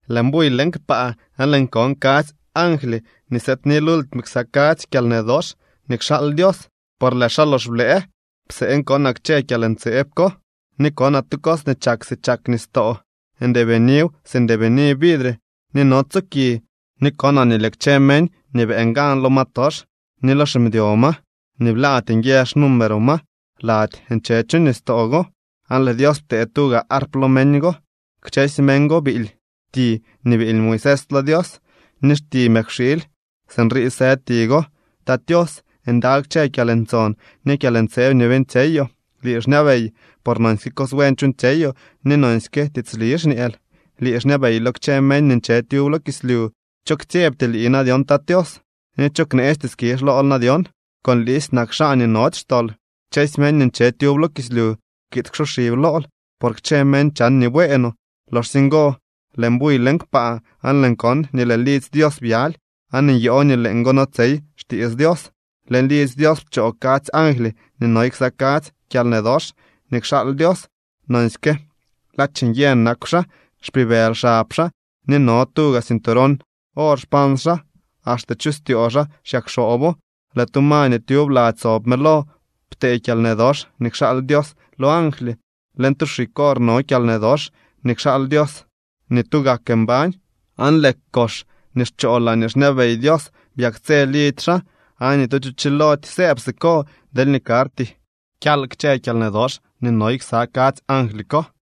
Lëën buy leñ kpaa aan lëën kon kadzy angly nii sëëdni lultime ksa kadzy kyalnë dox nii kxaal Dios por lëë xaa lox blëë. Pseen konaa kchë kyalntseeb ko. Ni konaa tu cos nii chak si chak nistoo. Ndeebiniw si ndeebini vidre ni notso ki. Ni konaa nii lëë kchë meñ nii beeñ gan lo ma tox ni lo ximdyo ma ni blaady nguië xnumero ma lady nche chu nistoo go. Aan lëë Dios ptee tuga arp lo meñ go. Kchësy meñ go biily ti nii biily Moisés lo Dios ni xti mëkwxiily. Sinrii së ti go: Tat Tios, ndaly kchë kyalntson ni kyalntseeb nii beeñtsyeyoo. Lii xñabey, por nonsyke cos buen chuuñtsyeyoo, ni nonsyke tiitsli xñeel. Lii xñabey lo kchë meñ nii nche tyub lo kislyu. ¿Cho ktsyebty lii na dyon, Tat Tios? ¿Ni cho kneesty skizh lool na dyon?, con liisy nak xaa nii nody xtol. Kchësy meñ nii nche tyub lo kislyu kiid ksoxib lool, por kchë meñ chan nii bueenoo. Loxsye ngo lëën buy leñ kpaa aan lëën kon nii lëë lidzy Dios byaly, aan nyoo nii leeñgo notsey xtiits Dios. Leñ lidzy Dios pchoo kadzy angly nii noy ksa kadzy kyalnë dox nii kxaal Dios. Nonsyke ladx nyë nakw xaa. Xpibëly xab xaa ni no tuga cinturón or xpans xaa. Axte chu styoo xaa xyakxoobo. Lëë tu ma nii tyub lady sob mëlo ptee kyalnë dox nii kxaal Dios lo angly. Leñ tu xig or no kyalnë dox nii kxaal Dios nii tugak mbañ. Aan lëë kox nii xchoo laañee xñabey Dios byaktsë lidzy xaa, aan ni tu cho chilody sëëb siko deelñee karty kyal kchë kyalnë dox nii noy ksa kadzy angly ko.